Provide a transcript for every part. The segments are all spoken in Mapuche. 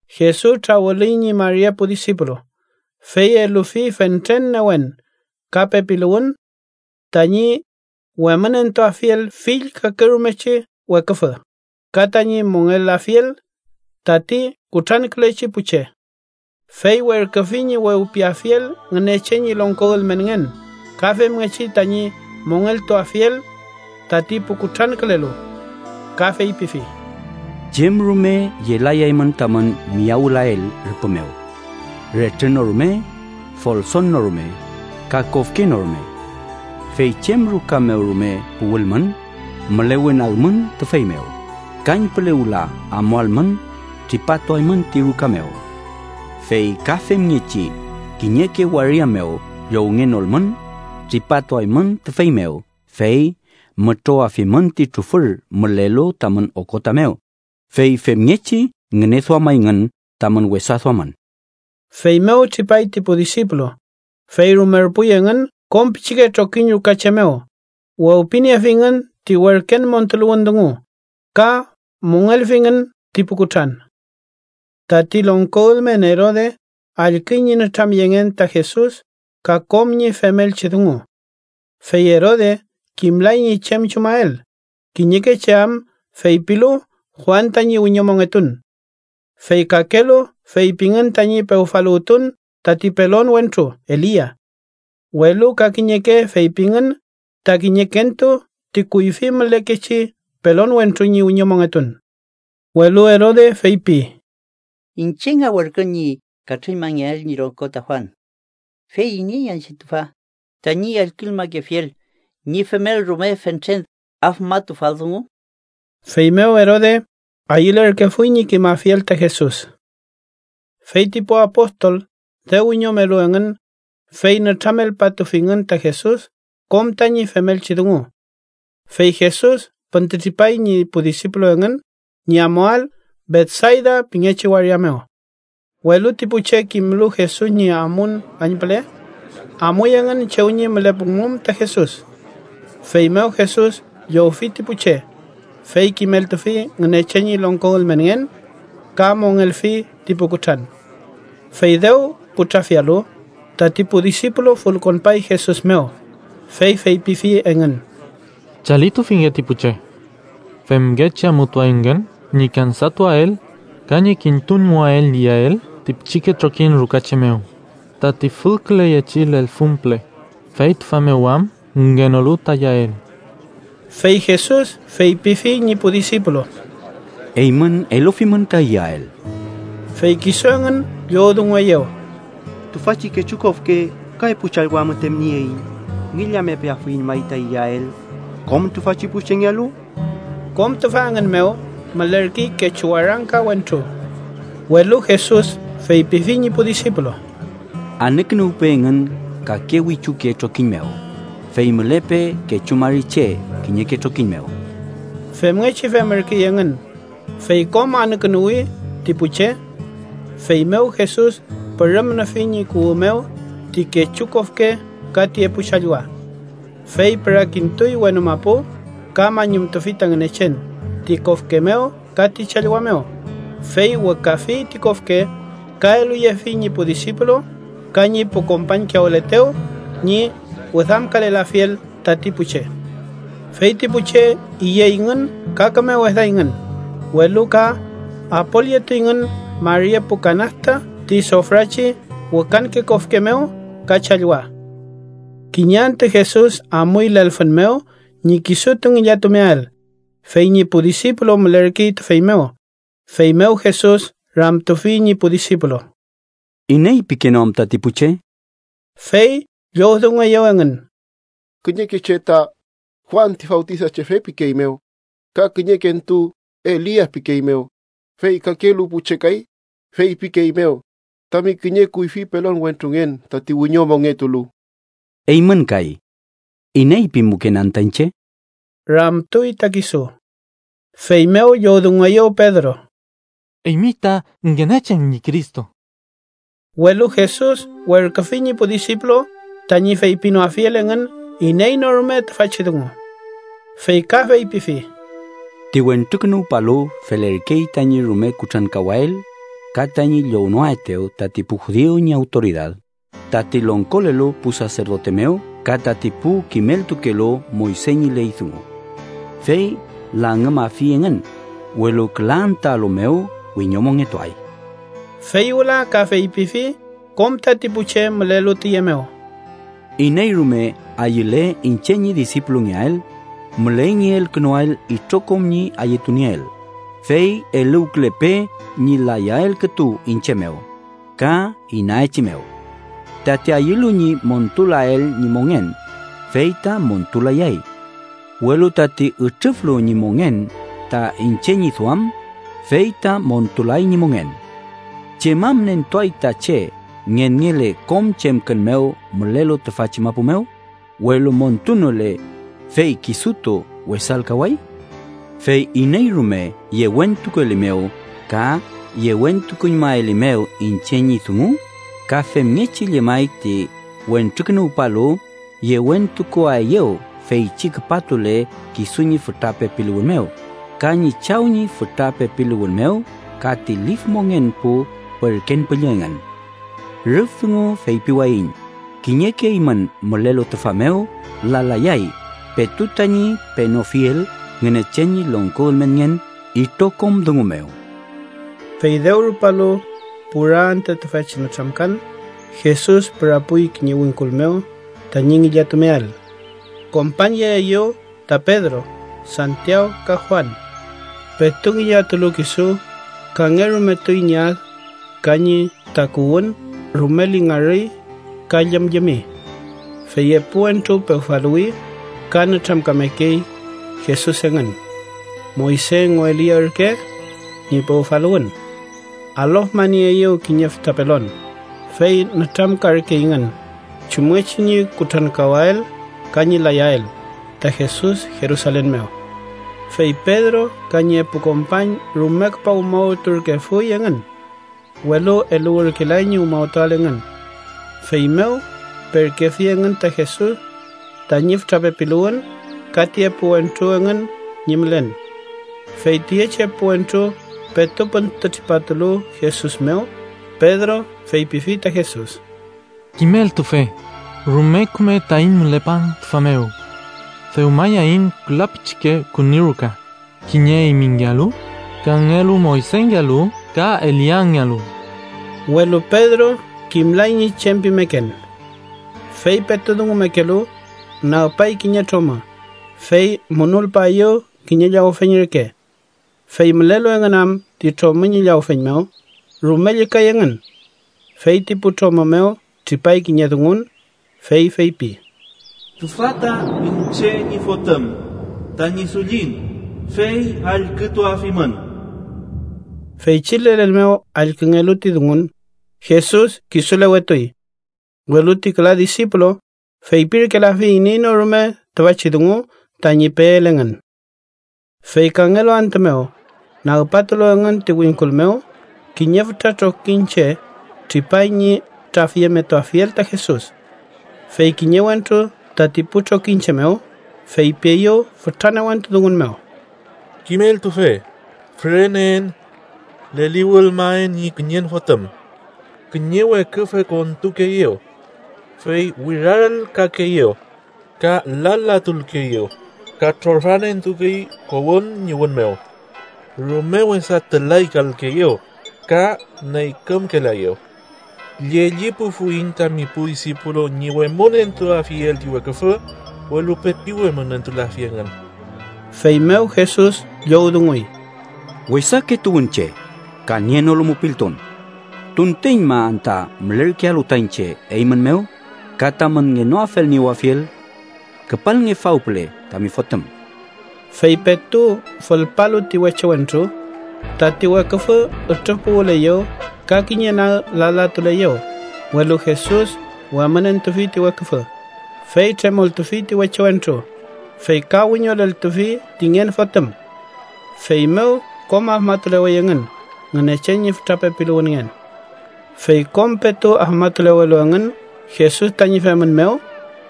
Jesus trawülüy ñi mari epu disipulu, fey elufi fentren newen ka pepiluwün tañi wemünentuafiel fill kakerumechi weküfü ka tañi mongelafiel tati kutrankülechi pu che. Fey werküfi ñi wewpiyeafiel Ngünechen ñi longko ülmenngen ka femngechi tañi mongeltuafiel tati pu kutrankülelu. Ka feypifi: —Chem rume yelayaymün tamün miyawülael rüpü mew: retrü no rume, folson no rume, ka kofke no rume. Fey chem ruka mew rume puwülmün, mülewenagmün tüfey mew, kañpüle wüla amualmün tripatuaymün ti ruka mew. Fey ka femngechi kiñeke waria mew llowngenolmün, tripatuaymün tüfey mew fey mütrowafimün ti trufür mülelu tamün okota mew, fey femngechi ngüneduamayngün tamün wesa duamün. Feymew tripay ti pu disipulu, fey rumerpuy engün kom pichike trokiñ ruka che mew, wewpiniefingün ti werken montuluwün dungu ka mongelfingün ti pu kutran. Tati longko ülmen Erode allküy ñi nütramyengen ta Jesus ka kom ñi femelchi dungu. Fey Erode kimlay ñi chem chumael, kiñeke che am feypilu Juan tañi wiñomongetun. Fey kakelu feypingün tañi pewfaluwtun tati pelon wentru Elia, welu ka kiñeke feypingün ta kiñekentu ti kuyfi mülekechi pelon wentru ñi wiñomongetun. Welu Erode feypi: “Iñche nga werkün ñi katrüñmangeael ñi longko ta Juan. ¿Fey iney anchi tüfa, tañi allküñmakefiel ñi femel rume fentren afmatufal dungu?” Feymew Erode ayülerkefuy ñi kimafiel ta Jesus. Fey ti pu apostol dew wiñomelu engün, fey nütramelpatufingün ta Jesus kom tañi femelchi dungu. Fey Jesus püntütripay ñi pu disipulu engün ñi amuael Betsayda pingechi waria mew. Welu ti pu che kimlu Jesus ñi amun kañpüle, amuy engün chew ñi mülepumum ta Jesus. Feymew Jesus llowfi ti pu che, fey kimeltufi Ngünechen ñi longko ülmenngen ka mongelfi ti pu kutran. Fey dew putrafialu, tati pu disipulu fülkonpay Jesus mew, fey feypifi engün: —Chalitufinge ti pu che. Femngechi amutuayngün ñi kansatuael ka ñi kintuñmuael iyael ti pichike trokiñ ruka che mew tati fülküleyechi lelfün püle, fey tüfa mew am ngenolu ta iyael. Fey Jesus feypifi ñi pu disipulu: —Eymün elufimün ta iyael. Fey kisu engün llowdungueyew: —Tüfachi kechu kofke ka epu challwa müten nieiñ. ¿Ngillamepeafuiñ may ta iyael kom tüfachi pu chengealu? Kom tüfa engün mew mülerkey kechu warangka wentru. Welu Jesus feypifi ñi pu disipulu: —Anükünuwpe engün kake wichuke trokiñ mew, fey mülepe kechu mari che kiñeke trokiñ mew. Femngechi femürkey engün, fey kom anükünuwi ti pu che. Feymew Jesus pürüm nüfi ñi kuwü mew ti kechu kofke ka ti epu challwa. Fey pürakintuy wenu mapu ka mañumtufi ta Ngünechen ti kofke mew ka ti challwa mew, fey wükafi ti kofke ka eluyefi ñi pu disipulu ka ñi pu kompañkiyawületew ñi wüdamkalelafiel tati pu che. Fey ti pu che iyeyngün ka küme wedayngün, welu ka apolyetuyngün mari epu kanasta ti sofrachi wükanke kofke mew ka challwa. Kiñe antü Jesus amuy lelfün mew ñi kisutu ngillatumeael, fey ñi pu disipulu mülerkey tüfey mew, feymew Jesus ramtufi ñi pu disipulu: —¿Iney pikeenew anta ti pu che? Fey llowdungueyew engün: —Kiñeke che ta Juan ti Fawtisachefe pikeeymew, ka kiñekentu Elia pikeeymew, fey kakelu pu che kay feypikeeymew tami kiñe kuyfi pelon wentrungen, tati wiñomongetulu. —Eymün kay, ¿iney pimuken anta iñche? ―ramtuy ta kisu. Feymew llowdungueyew Pedro: —Eymi ta Ngünechen ñi Cristo. Welu Jesus werküfi ñi pu disipulu tañi feypinoafiel engün iney no rume tüfachi dungu. Fey ka feypifi: —Ti Wentrukünuwpalu felerkey tañi rume kutrankawael, ka tañi llownoaetew tati pu judiu ñi awtoridad, tati longkolelu pu saserdote mew ka tati pu kimeltukelu Moyse ñi ley dungu. Fey langümafi engün, welu küla antüalu mew wiñomongetuay. Fey wüla ka feypifi kom tati pu che mülelu tüye mew: —Iney rume ayüle iñche ñi disipulungeael, müley ñi elkünuael itrokom ñi ayütunieel, fey eluwkülepe ñi layael kütu iñche mew ka inaechimew. Tati ayülu ñi montulael ñi mongen, fey ta montul-layay, welu tati ütrüflu ñi mongen ta iñche ñi duam, fey ta montulay ñi mongen. ¿Chem am nentuay ta che ngenngele kom chemkün mew mülelu tüfachi mapu mew, welu montunole, fey kisutu wesalkaway? Fey iney rume yewentukuelimew ka yewentukuñmaelimew iñche ñi dungu, ka femngechi llemay ti Wentrukünuwpalu yewentukuaeyew feychi küpatule kisu ñi fütra pepiluwün mew ka ñi Chaw ñi fütra pepiluwün mew ka ti lif mongen pu werken püllü engün. Rüf dungu feypiwayiñ kiñeke eymün mülelu tüfa mew lalayay petu tañi penofiel Ngünechen ñi longko ülmenngen itrokom dungu mew. Fey dew rupalu pura antü tüfachi nütramkan, Jesus pürapuy kiñe wingkul mew tañi ngillatumeael. Kompañyeeyew ta Pedro, Santiaw ka Juan. Petu ngillatulu kisu, kangerumetuy ñi ad ka ñi takuwün rume lingarüy ka llümllümi. Fey epu wentru pewfaluwi ka nütramkamekey Jesus engün. Moyse engu Elia ürke ñi pewfaluwün. Alofmanieeyew kiñe fütra pelon, fey nütramkarkeyngün chumngechi ñi kutrankawael ka ñi layael ta Jesus Jerusalen mew. Fey Pedro ka ñi epu kompañ rume küpa umawturkefuy engün, welu eluwürkelay ñi umawtuael engün. Feymew perkefi engün ta Jesus tañi fütra pepiluwün ka ti epu wentru engün ñi mülen. Fey tüyechi epu wentru petu püntütripatulu Jesus mew, Pedro feypifi ta Jesus: —Kimeltufe, ¡rume kümey taiñ mülepan tüfa mew! Dewmayaiñ küla pichike küni ruka, kiñe eymingealu, kangelu Moysengealu ka Eliangealu. Welu Pedro kimlay ñi chem pimeken. Fey petu dungumekelu, nagpay kiñe tromü, fey munulpaeyew kiñe llawfeñ reke. Fey mülelu engün am ti tromü ñi llawfeñ mew, rume llükay engün. Fey ti pu tromü mew tripay kiñe dungun, fey feypi: “Tüfa ta iñche ñi Fotüm, tañi Dullin, fey allkütuafimün.” Feychi lelen mew allküngelu ti dungun, Jesus kisulewetuy. Welu ti küla disipulu feypirkelafi iney no rume tüfachi dungu tañi peel engün. Fey kangelu antü mew, nagpatulu engün ti wingkul mew, kiñe fütra trokiñche tripay ñi trafyemetuafiel ta Jesus. Fey kiñe wentru tati pu trokiñche mew feypieyew fütra newentu dungun mew: —Kimeltufe, füreneen. Leliwülmaen ñi kiñen fotüm. Kiñe weküfü kontukeeyew, fey wirarelkakeeyew ka lalatulkeeyew ka trorfan entukey kowün ñi wün mew. Rume wesa tülaykalkeeyew ka neykümkelaeyew. Llellipufuiñ tami pu disipulu ñi wemünentuafiel ti weküfü, welu pepi wemünentulafi engün. Feymew Jesus llowdunguy: —¡Wesake tuwünche, ka nienolu mupiltun! ¿Tunteñma anta mülerkealu ta iñche eymün mew ka tamün ngenoafelniewafiel? Küpalnge faw püle tami fotüm. Fey petu fülpalu ti weche wentru, tati weküfü ütrüfpuwüleyew ka kiñe nag lalatuleyew, welu Jesus wemünentufi ti weküfü, fey tremoltufi ti weche wentru, fey ka wiñoleltufi ti ngen fotüm. Feymew kom afmatulewey engün Ngünechen ñi fütra pepiluwünngen. Fey kom petu afmatulewelu engün Jesus tañi femün mew,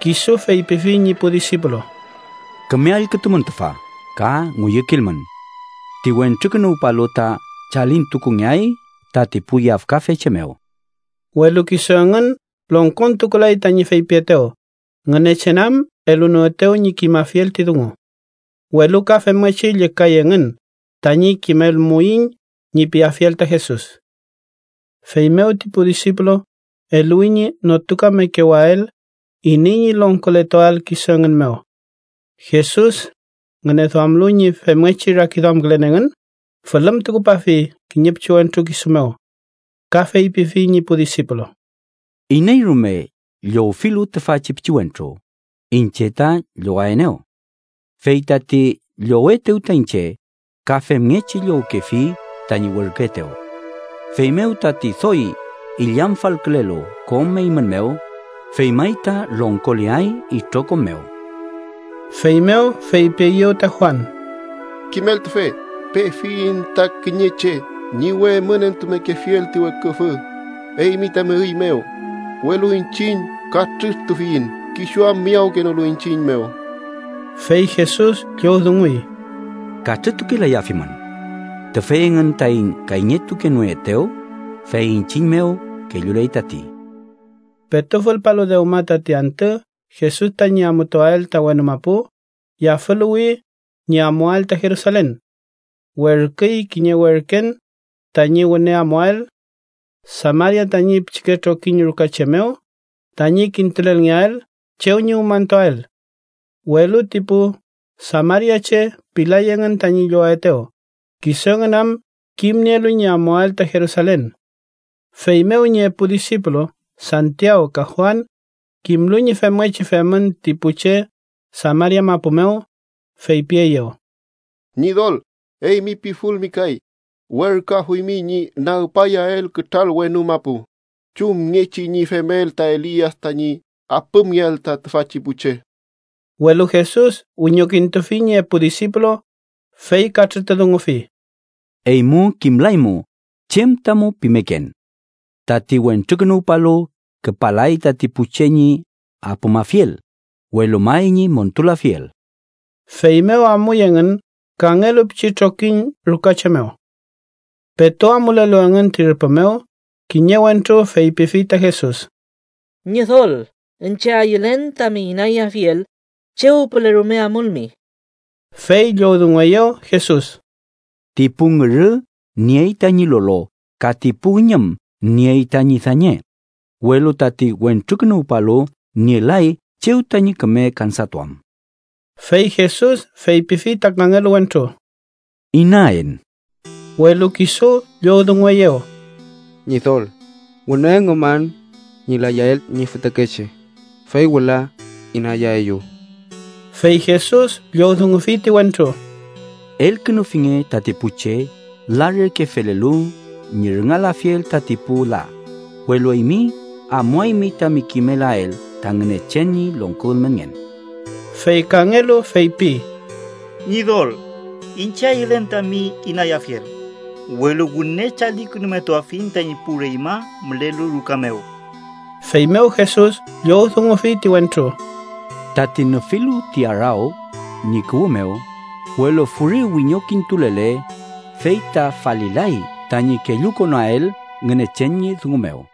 kisu feypifi ñi pu disipulu: —Küme allkütumün tüfa ka ngüyükilmün. Ti Wentrukünuwpalu ta chalintukungeay tati pu yafkafe che mew. Welu kisu engün longkontukulay tañi feypietew, Ngünechen am elunoetew ñi kimafiel ti dungu. Welu ka femngechi llükay engün tañi “kimelmuiñ” ñi piafiel ta Jesus. Feymew ti pu disipulu eluwi ñi notukamekewael iney ñi longkoletuael kisu engün mew. Jesus, ngüneduamlu ñi femngechi rakiduamkülen engün, fülümtukupafi kiñe pichiwentru kisu mew. Ka feypifi ñi pu disipulu: —Iney rume llowfilu tüfachi pichiwentru, iñche ta llowaenew. Fey tati llowetew ta iñche, ka femngechi llowkefi tañi werküetew. Feymew tati doy illamfalkülelu kom eymün mew, fey may ta longkoleay itrokom mew. Feymew feypieyew ta Juan: —Kimeltufe, pefiyiñ ta kiñe che ñi wemünentumekefiel ti weküfü eymi tami üy mew, welu iñchiñ katrütufiyiñ kisu am miyawkenolu iñchiñ mew. Fey Jesus llowdunguy: —Katrütukelayafimün. Tüfey engün taiñ kayñetukenoetew, fey iñchiñ mew kelluley tati. Petu fülpalu dewma tati antü Jesus tañi amutuael ta wenu mapu, yafüluwi ñi amuael ta Jerusalen. Werküy kiñe werken tañi wüne amuael Samaria tañi pichike trokiñ ruka che mew tañi kintulelngeael chew ñi umañtuael. Welu ti pu samariache pilay engün tañi llowaetew, kisu engün am kimnielu ñi amuael ta Jerusalen. Feymew ñi epu disipulu Santiaw ka Juan, kimlu ñi femngechi femün ti pu che Samaria mapu mew, feypieyew: —Ñidol, ¿eymi pifulmi kay, werküafuymi ñi nagpayael kütral wenu mapu, chumngechi ñi femel ta Elia tañi apümngeael ta tüfachi pu che? Welu Jesus wiñokintufi ñi epu disipulu, fey katrütudungufi: —Eymu kimlaymu chem tamu pimeken. Tati Wentrukünuwpalu küpalay tati pu che ñi apümafiel, welu may ñi montulafiel. Feymew amuy engün kangelu pichi trokiñ ruka che mew. Petu amulelu engün ti rüpü mew, kiñe wentru feypifi ta Jesus: —Ñidol, iñche ayülen tami inayafiel, chew püle rume amulmi. Fey llowdungueyew Jesus: —Ti pu ngürü niey tañi lolo ka ti pu üñüm niey tañi dañe, welu tati Wentrukünuwpalu nielay chew tañi küme kansatuam. Fey Jesus feypifi ta kangelu wentru: —Inaen. Welu kisu llowdungueyew: —Ñidol, wüne üngüman ñi layael ñi fütakeche, fey wüla inayaeyu. Fey Jesus llowdungufi ti wentru: —Elkünufinge tati pu che la reke felelu ñi rüngalafiel tati pu la, welu eymi amuaymi tami kimelael ta Ngünechen ñi longko ülmenngen. Fey kangelu feypi: —Ñidol, iñche ayülen tami inayafiel, welu wüne chalikünumetuafiñ tañi pu reñma mülelu ruka mew. Feymew Jesus llowdungufi ti wentru: —Tati nüfilu ti araw ñi kuwü mew, welu furi wiñokintulele, fey ta falilay tañi kellukonael Ngünechen ñi dungu mew.